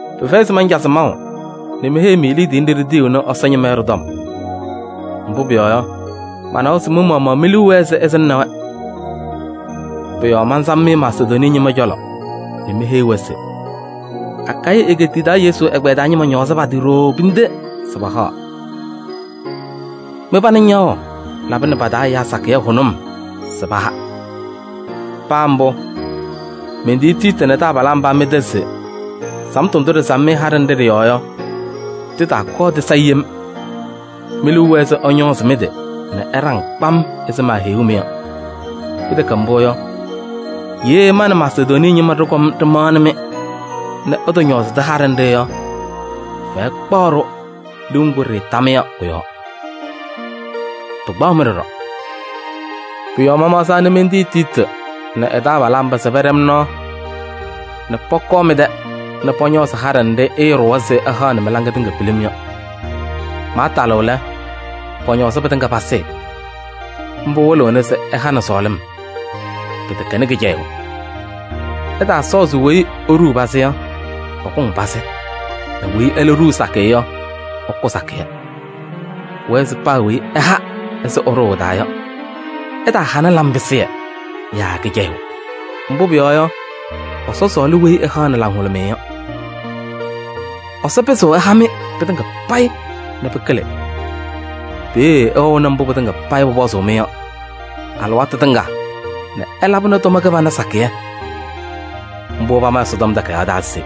Pɩfɛyɩ se mancazɩ-mɩ maʋ nɛ meheyi-mɩ liidiye nɖɩ ɖitiyiɣnɩ Ɛsɔ ñɩma yɔ ɖɩ-tɔm. Mbʋ pʋyɔɔ yɔ, manawa se mɩ-maɣmaɣ mi-liu wɛɛ se ɩsɩŋnɩ-wɛ. Pʋ-yɔɔ mansam-mɩ Masedonii ñɩma cɔlɔ nɛ meheyi-wɛ se: “Akayɩ egeetiye taa Yesu ɛgbɛyɛ taa ñɩma ñɔɔzɩ pa-tɩ ɖooo pinde se pahaɣ. Mɩ-pana ñaɣʋ labɩnɩ pa-taa ɛyaa sakɩyɛ hʋnʋm se paha.” Paa mbʋ, mentiyi Tiiti nɛ taabalaa mba mɩ-tɛ se samtʋ ndʋ ɖɩsam-mɩ haɖɛ nɖɩ ɖɩ-yɔɔ yɔ, tɩtaakɔɔ tɩsayɩ yem. Me-liu wɛɛ se ɩñɔɔzɩ mɩ-tɩ nɛ ɩɖaŋ kpam ɛzɩ meheyuu-mɩ yɔ. Pɩtɛkɛ mbʋ yɔ, ye ma nɛ Masedonii ñɩma ɖɩkɔm ɖɩmaɣnɩ-mɩ nɛ ɩtɔñɔɔzɩdɩ haɖɛ nɖɩ yɔ, fɛyɛ kpaɣ-ɖʋ liu ŋgʋ ɖɩɩta-mɩ yɔ kʋ-yɔɔ. Pɩkpaɣ-mɩ ɖɔɖɔ. Pʋ-yɔɔ mamaɣzaa nɛ mentendi Tiiti nɛ ɛ-taabalaa mba se pañaɣ pana pɛɖɛ-m nɔɔ nɛ pɔkɔɔ mɩ-tɛ nɛ pɔñɔɔzɩ haɖɛ nɖɩ ɩɩɖʋwa se ɩhaɣnɩ mɩ-laŋɩyɛ tɩŋa yɔ. Maatalɩɣ lɛ, pɔñɔɔzɩ pɩtɩŋa pasɩɩ. Mbʋ wɩlɩɣna se ɩhanɩ sɔɔlɩm, pɩtɛkɛnɩ kɩcɛyʋʋ. Ɩtaasɔɔ se weyi eɖuu pazɩ yɔ, ɛkʋŋ pazɩ nɛ weyi ɛlɛ ɖuu sakɩyɛ yɔ, ɛkʋ sakɩyɛ. Pʋwɛɛ se paa weyi ɛha ɛzɩ ɛɖʋʋ ɛ-taa yɔ. Ɛtaahanɩ laŋpɩsɩyɛ yaa kɩcɛyʋʋ. Mbʋ pʋyɔɔ yɔ, Ɛsɔ sɔɔlɩ weyi ɛhaɣnɩ laŋhʋlʋmɩyɛ yɔ. Ɛsɔ pɩzɩɣ ɛha-mɩ pɩtɩŋa payɩ nɛ pɩkɩlɩ. Peeye ɩwɛɣnɩ mbʋ pɩtɩŋa payɩ pʋpɔzʋʋ-mɩ yɔ alɩwaatʋ tɩŋa nɛ ɩlabɩnɩ tʋma kɩbana sakɩyɛ. Mbʋ pama Ɛsɔtɔm Takayaɣ taa se: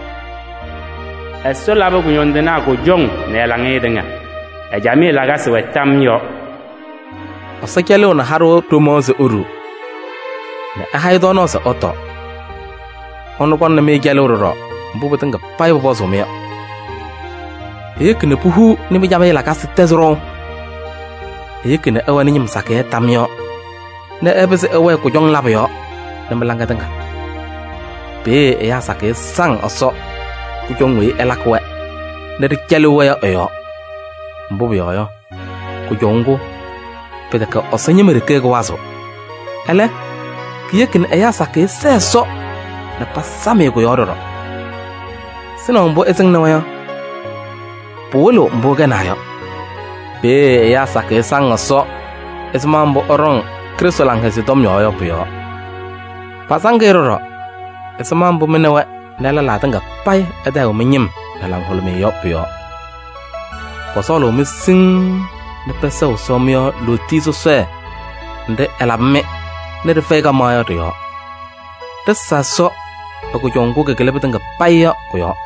“Ɛsɔ labɩ kʋñɔndɩnaa kʋjɔŋ nɛ ɛ-laŋɩyɛ tɩŋa. Ɛ-camɩyɛ lakasɩ wɛ tam yɔɔ.” Ɛsɔ cɛlɩɣnɩ haɖʋ ɖomaɣ se eɖuu nɛ ɛhaɣ-ɩ tɔɔnaɣ se ɛtɔɔ. Ɛnʋ kɔŋnɩ-mɩ cɛlʋʋ ɖɔɖɔ mbʋ pɩtɩŋa payɩ pʋpɔzʋʋ-mɩ yɔ. Eyeki nɛ puhuu nɛ mɩ-camɩyɛ lakasɩ tɛzɩ ɖɔʋ. Eyeki nɛ ɩwɛnɩ ñɩm sakɩyɛ tam yɔɔ nɛ ɩpɩzɩ ɩwɛɛ kʋjɔŋ labʋ yɔɔ nɛ mɩ-laŋa tɩŋa. Peeye ɛyaa sakɩyɛ saŋ Ɛsɔ kʋjɔŋ weyi ɩlakɩ-wɛ nɛ ɖɩcɛlɩɣ-wɛ yɔ ɩ-yɔɔ. Mbʋ pʋyɔɔ yɔ, kʋjɔʋ ŋgʋ, pɩtɛkɛ Ɛsɔ ñɩma ɖeke kɩwazɩɣ. Ɛlɛ, kiyeki nɛ ɛyaa sakɩyɛ sɛɛ Ɛsɔ nɛ pasam-ɩ kʋ-yɔɔ ɖɔɖɔ. Sɩnaʋ mbʋ ɩsɩŋnɩ-wɛ yɔ, pɩwɩlɩɣ mbʋ ɩkɛnaa yɔ. Peeye ɛyaa sakɩyɛ saŋ Ɛsɔ ɛzɩma mbʋ ɩɖɔŋ Krɩstʋ Laŋhɛzɩyɛ Tɔm yɔɔ yɔ pʋ-yɔɔ. Pasaŋ-ɩ ɖɔɖɔ ɛzɩma mbʋ mɩ nɛ wɛ nɛ lɛlaa tɩŋa payɩ ɩtayɩɣ mɩ-ñɩm nɛ laŋhʋlʋmɩyɛ yɔ pʋ-yɔɔ. Pɔsɔɔlʋʋ-mɩ siŋŋ nɛ pɛsɛɣ Ɛsɔ mɩ-yɔɔ lootiye sɔsɔɖɛ nɖɩ ɛlabɩ-mɩ nɛ ɖɩfɛyɩ kaɣmaɣ yɔ ɖɩ-yɔɔ. Ɖɩsa Ɛsɔ ɛ-kʋjɔʋ ŋgʋ kɩkɩlɩ pɩtɩŋa payɩ yɔ kʋ-yɔɔ!